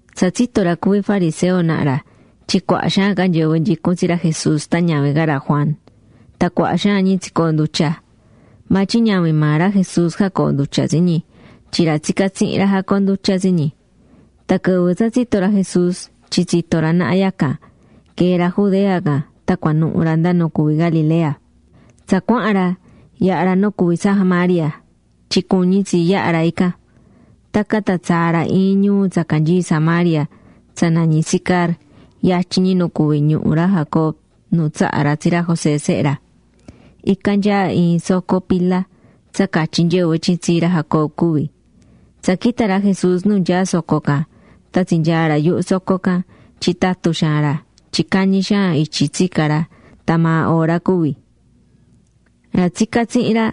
Tsa tsito̱ ra cuví fariseo naha ra tyin cuaha xaan ca nyɨvɨ nyicún tsi ra Jesús tan ñavin ca ra Juan. Tan cuaha xaan ñi tsicoondutya̱. Maa tyin ñavin maa ra Jesús jacoondutyá tsi ñi, tyin ra tsicá tsihin ra jacoondutyá tsi ñi. Tan quɨvɨ tsa tsito̱ ra Jesús tyin tsito̱ ra naha yacan, quee̱ ra Judea can tan cuanuhu̱ ra nda nu cuví Galilea. Tsa cuahán ra, yaha ra nu cuví Samaria tyin cuñí tsi yaha ra ican. Tacan tan tsaa̱ ra iin ñuu tsa canyií Samaria tsa nañí Sicar yatyin ñi nu cuví ñuhu ra Jacob nu tsaha̱ ra tsi ra José sehe ra. Ican nyaá iin soco pila tsa catyí nyɨvɨ tyin tsii ra Jacob cuví. Tsa quita̱ ra Jesús nu nyaá soco can tan tsinyaa̱ ra yuhu soco can tyin tatu xaan ra tyin cañi xaan ityi tsica̱ ra tan maa hora cuví. Ra tsicá tsihin ra,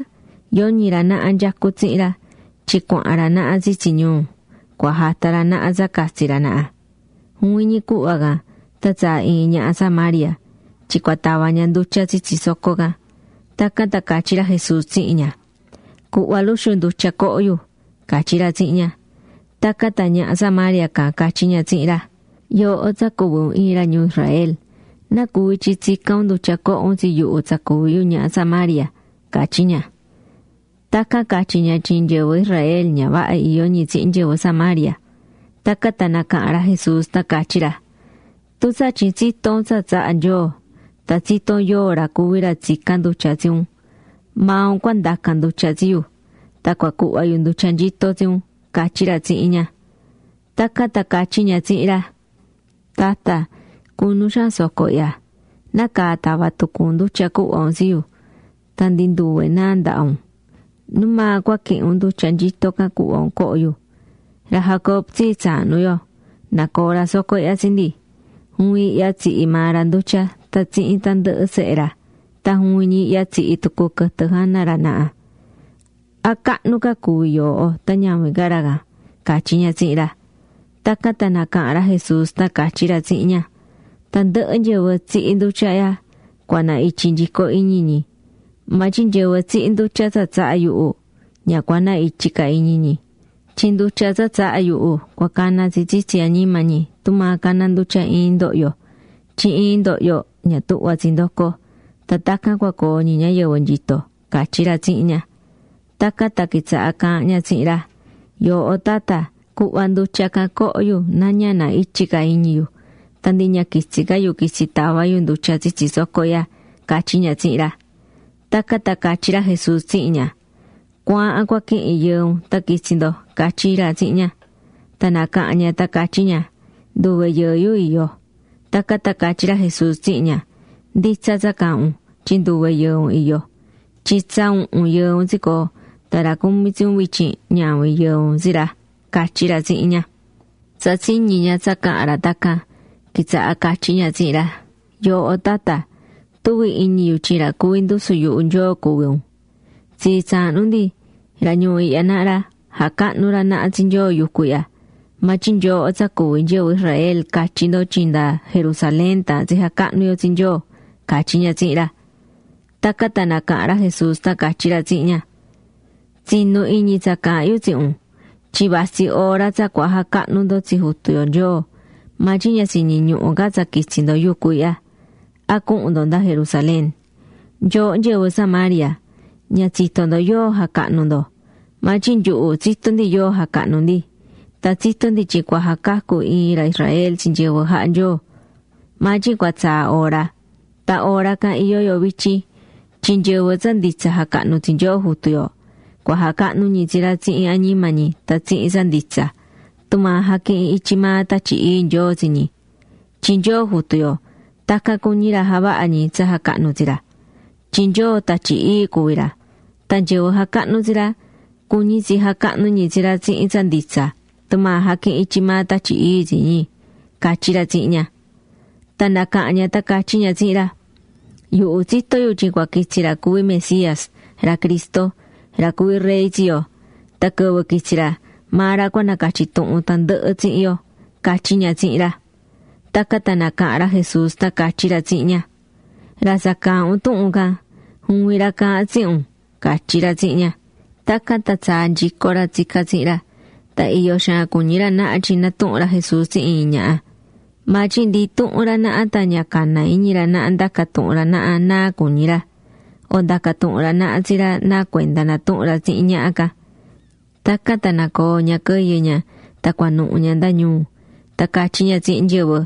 yoñi ra naha nyecú tsihin ra tyin cuahán ra naha tsitsi ñuu, cua jata ra naha tsa catsi ra naha. Juvin ñi cuhva can tan tsaa̱ iin ñaha Samaria tyin cua tava ña ndutya tsitsi soco can. Tacan tan catyí ra Jesús tsihin ña: ―Cu̱hva luxu ndutya coho yu ―catyí ra tsihin ña. Tacan tan ñaha Samaria can catyí ña tsihin ra: ―Yooho tsa cuví un iin ra ñuu Israel, ¿nacuvi tyin tsicán un ndutya coho un tsi yuhu tsa cuví yu ñaha Samaria? ―catyí ña. (Tacan catyi̱ ña tyin nyɨvɨ Israel ña vaha iyó ñi tsihin nyɨvɨ Samaria.) Tacan tan nacaha̱n ra Jesús tan catyí ra: ―Tun tsatyin tsitó un tsa tsahá Nyoo, tan tsitó un yóo ra cuví ra tsicán ndutya tsi un, maa un cua ndacan ndutya tsi yu. Tan cua cuhva yu ndutya nyito tsi un ―catyí ra tsihin ña. Tacan tan catyí ña tsihin ra: ―Tatta, cunu xaan soco ihya. ¿Nacaa tava tucu un ndutya cuhva un tsi yu? tan ndi nduve náa ndaha un ¿Nu maa cua quihin un ndutya nyito can cuhva un coho yu? Ra Jacob tsii tsahnu yo, nacoo̱ ra soco ihya tsi ndi. Juvin ihya tsihi̱ maa ra ndutya tan tsihin tandɨhɨ sehe ra. Tan juvin ñi ihya tsihi̱ tucu quɨtɨ jana ra naha. ¿A cahnu ca ra cuví yooho tan ñavin ca ra can? ―catyí ña tsihin ra. Tacan tan nacaha̱n ra Jesús tan catyí ra tsihin ña: ―Tandɨhɨ nyɨvɨ tsihí ndutya ihya, cua na ityi nyico iñi ñi. Maa tyin nyɨvɨ tsihí ndutya tsa tsahá yuhu, ña cua na ityi ca iñi ñi. Tyin ndutya tsa tsahá yuhu cua cana tsi tsitsi añima ñi tumaa caná ndutya iin ndohyo, tyin iin ndohyo ña tuhvá tsi ndoco. Tan tacan cua coo ñi ñayɨvɨ nyito ―catyí ra tsihin ña. Tacan tan quitsaha̱ caahán ña tsihin ra: ―Yooho tatta, cu̱hva ndutya can coho yu na ña na ityi ca iñi yu, tan ndi ña quitsi ca yu quitsi tava yu ndutya tsitsi soco ihya ―catyí ña tsihin ra. Tacan tan catyí ra Jesús tsihin ña: ―Cu̱aahan cua quihin yɨɨ un tan qu̱itsi ndo ―catyí ra tsihin ña. Tan nacaha̱n ña tan catyí ña: ―Nduve yɨɨ yu iyó. Tacan tan catyí ra Jesús tsihin ña: ―Nditsa tsa caahán un, tyin nduve yɨɨ un iyó. Tyin tsa uhun yɨɨ un tsicoo̱, tan ra cumí tsi un vityin ñavin yɨɨ un tsi ra. ―catyí ra tsihin ña. Tsa tsiñi̱ ña tsa caha̱n ra tacan, quitsaha̱ catyí ña tsihin ra: ―Yooho tatta, tuví iñi yu tyin ra cuví ndusu yuhu Nyoo cuví un. Tsii tsahnu ndi, ra ñuu ihya naha ra, jacahnu̱ ra naha tsi Nyoo yucu ihya. Maa tyin nyooho tsa cuví nyɨvɨ Israel catyí ndo tyin nda Jerusalén taahán tsi jacahnu yo tsi Nyoo ―catyí ña tsihin ra. Tacan tan nacaha̱n ra Jesús tan catyí ra tsihin ña: ―Tsi̱nu iñi tsa caahán yu tsihin un. Tyin vatsí hora tsa cua jacahnu ndo tsi Jutu yo Nyoo. Maa tyin ña tsiñiñuhu̱ ca tsa quitsi ndo yucu ihya, a cuhun ndo nda Jerusalén. Nyooho nyɨvɨ Samaria, ña tsitó ndo yóo jacahnú ndo. Maa tyin nyuhu tsitó ndi yóo jacahnú ndi. Tan tsitó ndi tyin cua jacacu iin ra Israel tsi nyɨvɨ jaha Nyoo. Maa tyin cua tsaa hora, tan hora can iyó yo vityin tyin nyɨvɨ tsa nditsa jacahnú tsi Nyoo Jutu yo, cua jacahnu ñi tsi ra tsihin añima ñi tan tsihin tsa nditsa. Tumaa jaquihín ityi maa Tatyi Ii Nyoo tsi ñi. Tyin Nyoo Jutu yo tacan cuñí ra javaha ñi tsa jacahnú tsi ra. Tyin Nyoo Tatyi Ii cuví ra. Tan nyɨvɨ jacahnú tsi ra cuñí tsi jacahnú ñi tsi ra tsihin tsa nditsa tumaa jaquihín ityi maa Tatyi Ii tsi ñi ―catyí ra tsihin ña. Tan nacaha̱n ña tan catyí ña tsihin ra: ―Yuhu tsitó yu tyin cua quitsi ra cuví Mesías, ra Cristo, ra cuví rey tsi yo. Tan quɨvɨ quitsi ra, maa ra cua nacatyi tuhun tandɨhɨ tsihin yo ―catyí ña tsihin ra. Tacan tan nacaha̱n ra Jesús tan catyí ra tsihin ña: ―Ra tsa caahán un tuhun can, juvin ra caahán tsihin un ―catyí ra tsihin ña. Tacan tan tsaa̱ nyico ra tsicá tsihin ra, tan iyo xaan cuñí ra naha tyin natuhún ra Jesús tsihin iin ñaha. Maa tyin ndi intuhun ra naha tan ña caná iñi ra naha ndaca tuhun ra naha náa cuñí ra, o ndaca tuhun ra naha tsi ra nacuenda natuhún ra tsihin ñaha can. Tacan tan nacoo̱ ña quɨyɨ ña tan cuanuhu ña nda ñuu. Tan catyí ña tsihin nyɨvɨ: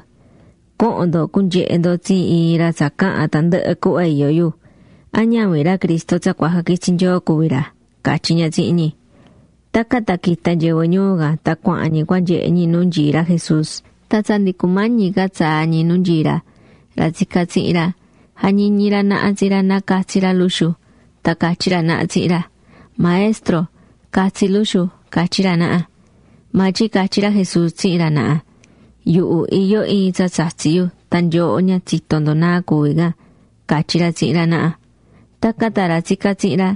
―Co̱hon ndo cu̱nyehe ndo tsi iin ra tsa caha̱n tandɨhɨ cuhva iyó yu. ¿A ñavin ra Cristo tsa cua jaquitsi Nyoo cuví ra? ―catyí ña tsihin ñi. Tacan tan quita̱ nyɨvɨ ñuu can tan cuahán ñi cua nyehe ñi nu nyií ra Jesús. Tan tsa ndi cumañi ca tsaa ñi nu nyií ra, ra tsicá tsihin ra, jañiñí ra naha tsi ra na catsi ra luxu. Tan catyí ra naha tsihin ra: ―Maestro, ca̱tsi luxu ―catyí ra naha. Maa tyin catyí ra Jesús tsihin ra naha: ―Yuhu iyó iin tsa tsatsí yu tan nyooho ña tsitó ndo náa cuví can ―catyí ra tsihin ra naha. Tacan tan ra tsicá tsihin ra,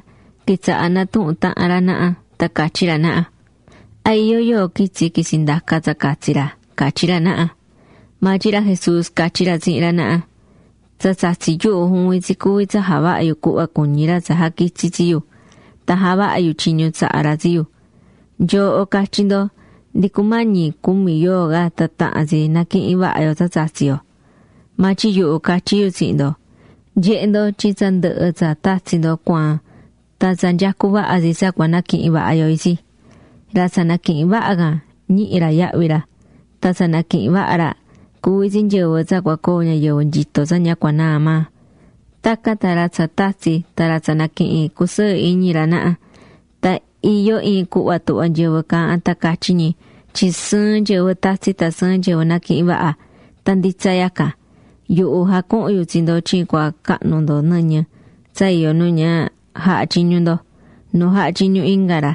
quitsaha̱ natuhún tahan ra naha, tan catyí ra naha: ―¿A iyó yóo quitsi̱ quitsi̱ ndaca tsa catsi ra? ―catyí ra naha. Maa tyin ra Jesús catyí ra tsihin ra naha: ―Tsa tsatsí yuhu juvin tsi cuví tsa javahá yu cuhva cuñí ra tsa jaquitsi̱ tsi yu, tan javahá yu tyiñu tsaha̱ ra tsi yu. Nyooho catyí ndo: “Ndi cumañi cumi yoo ca tan tahan tsi naquihin vaha yo tsa tatsi̱ yo.” Maa tyin yuhu catyí yu tsihin ndo: Nye̱he ndo tyin tsa ndɨhɨ tsa tatsi̱ ndo cuaan tan tsa nyecú vaha tsi tsa cua naquihin vaha yo itsi. Ra tsa naquihín vaha can ñihí ra yahvi ra. Tan tsa naquihín vaha ra, cuví tsi nyɨvɨ tsa cua coo ñayɨvɨ nyito tsa ña cua naa maa. Tacan tan ra tsa tatsi̱ tan ra tsa naquihín cusɨɨ iñi ra naha. Tan iyó iin cuhva tuhvá nyɨvɨ caahán tan catyí ñi tyin sɨɨn nyɨvɨ tatsí tan sɨɨn nyɨvɨ naquihín vaha. Tan nditsa yacan. Yuhu jacuhu̱n yu tsi ndo tyin cua cahnu ndo nɨñɨ tsa iyó nu ña jaha̱ tyiñu ndo, nu jaha̱ tyiñu inga ra.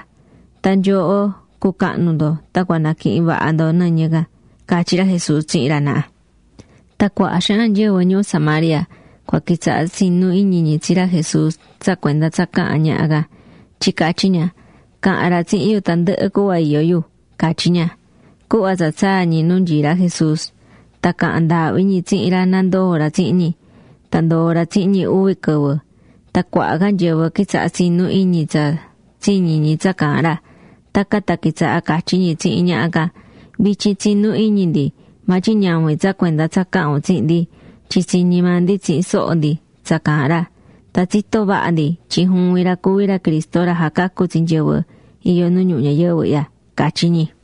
Tan nyooho cucahnu ndo tan cua naquihin vaha ndo nɨñɨ can ―catyí ra Jesús tsihin ra naha. Tan cuaha xaan nyɨvɨ ñuu Samaria can quitsaha̱ tsinú iñi ñi tsi ra Jesús tsa cuenda tsa caha̱n ñaha can, tyin catyí ña: “Caha̱n ra tsihin yu tandɨhɨ cuhva iyó yu”, catyí ña. Cuhva tsa tsaa̱ ñi nu nyií ra Jesús, tan caha̱n ndaahvi ñi tsihin ra na ndoo ra tsihin ñi. Tan ndoo̱ ra tsihin ñi uvi quɨvɨ. Tan cuaha ca nyɨvɨ quitsaha̱ tsinú iñi ñi tsa tsiñi̱ ñi tsa caahán ra. Tacan tan quitsaha̱ catyí ñi tsihin ñaha can: ―Vityin tsinú iñi ndi, maa tyin ñavin tsa cuenda tsa caha̱n un tsihin ndi, tyin tsiñi̱ maa ndi tsihin soho ndi tsa caahán ra, tan tsitó vaha ndi tyin juvin ra cuví ra Cristo ra jacacú tsi nyɨvɨ iyó nu ñuhu ñayɨvɨ ihya ―catyí ñi.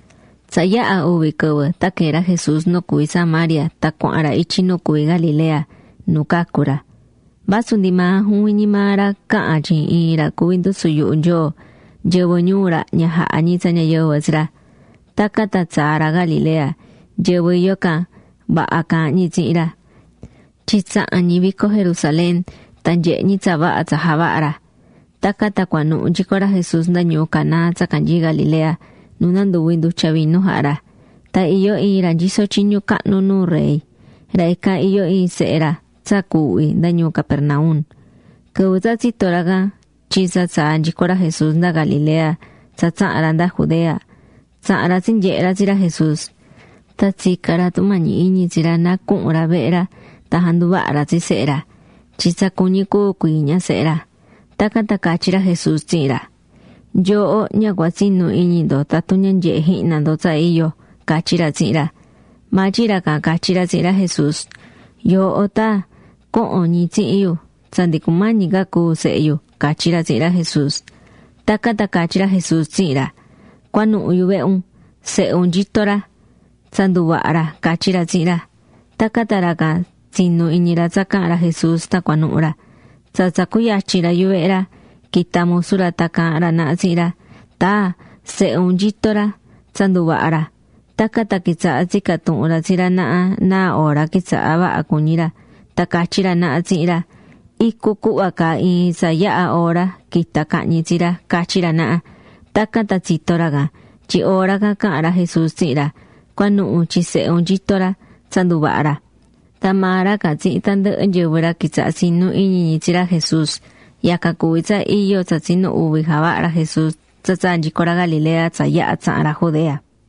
Tsa yaha̱ uvi quɨvɨ tan quee̱ ra Jesús nu cuví Samaria tan cuahán ra ityi nu cuví Galilea, nu cacu̱ ra. Vasu ndi maa juvin ñi maa ra caha̱n tyin iin ra cuví ndusu yuhu Nyoo, nyɨvɨ ñuu ra ña jahá ñi tsa ñayɨvɨ tsi ra. Tacan tan tsa tsaa̱ ra Galilea, nyɨvɨ iyó ican, vaha caahán ñi tsihin ra, tyin tsaha̱n ñi vico Jerusalén, tan nyehe̱ ñi tsa vaha tsa javaha̱ ra. Tacan tan cuanuhu nyico ra Jesús nda ñuu Caná tsa canyií Galilea nu nanduvi̱ ndutya vinu jaha̱ ra. Tan iyó iin ra nyisó tyiñu cahnu nuu rey. Ra ican iyó iin sehe ra tsa cuuhví nda ñuu Capernaum. Quɨvɨ tsa tsito̱ ra can tyin tsa tsaa̱ nyico ra Jesús nda Galilea tsa tsaha̱n ra nda Judea, tsaha̱n ra tsinyehe̱ ra tsi ra Jesús. Tan tsica̱n ra tumañi iñi tsi ra na cuhun ra vehe ra tan janduvaha ra tsi sehe ra, tyin tsa cuñí cúu cuii ña sehe ra. Tacan tan catyí ra Jesús tsihin ra: ―Nyooho ña cua tsinu iñi ndo tatun ña nyehe jihna ndo tsa iyo ―catyí ra tsihin ra. Maa tyin ra can catyí ra tsihin ra Jesús: ―Yooho taa, co̱hon ñi tsihin yu tsa ndi cumañi ca cúu sehe yu ―catyí ra tsihin ra Jesús. Tacan tan catyí ra Jesús tsihin ra: ―Cua̱nuhu yuvehe un. Sehe un nyito ra, tsa nduvaha̱ ra ―catyí ra tsihin ra. Tacan tan ra can tsinu̱ iñi ra tsa caha̱n ra Jesús tan cuanuhu̱ ra. Tsa tsa cuyatyi̱n ra yuvehe ra, quita̱ musu ra tan caahán ra naha tsihin ra: ―¡Taa, sehe un nyito ra; tsa nduvaha̱ ra! Tacan tan quitsaha̱ tsica̱ tuhun ra tsi ra naha náa hora quitsaha̱ vaha cuñí ra. Tan catyí ra naha tsihin ra: ―Icu cuhva caa iin tsa yaha̱ hora quita̱ cahñi tsi ra ―catyí ra naha. Tacan tan tsito̱ ra can, tyin hora can caha̱n ra Jesús tsihin ra, “Cu̱anuhu tyin sehe un nyito ra, tsa nduvaha̱ ra.” Tan maa ra can tsihin tandɨhɨ nyɨvɨ ra quitsaha̱ tsinú iñi ñi tsi ra Jesús. Yacan cuví tsa iyo tsa tsinu uvi javaha̱ ra Jesús tsa tsaa̱ nyico ra Galilea tsa yaha tsaha̱n ra Judea.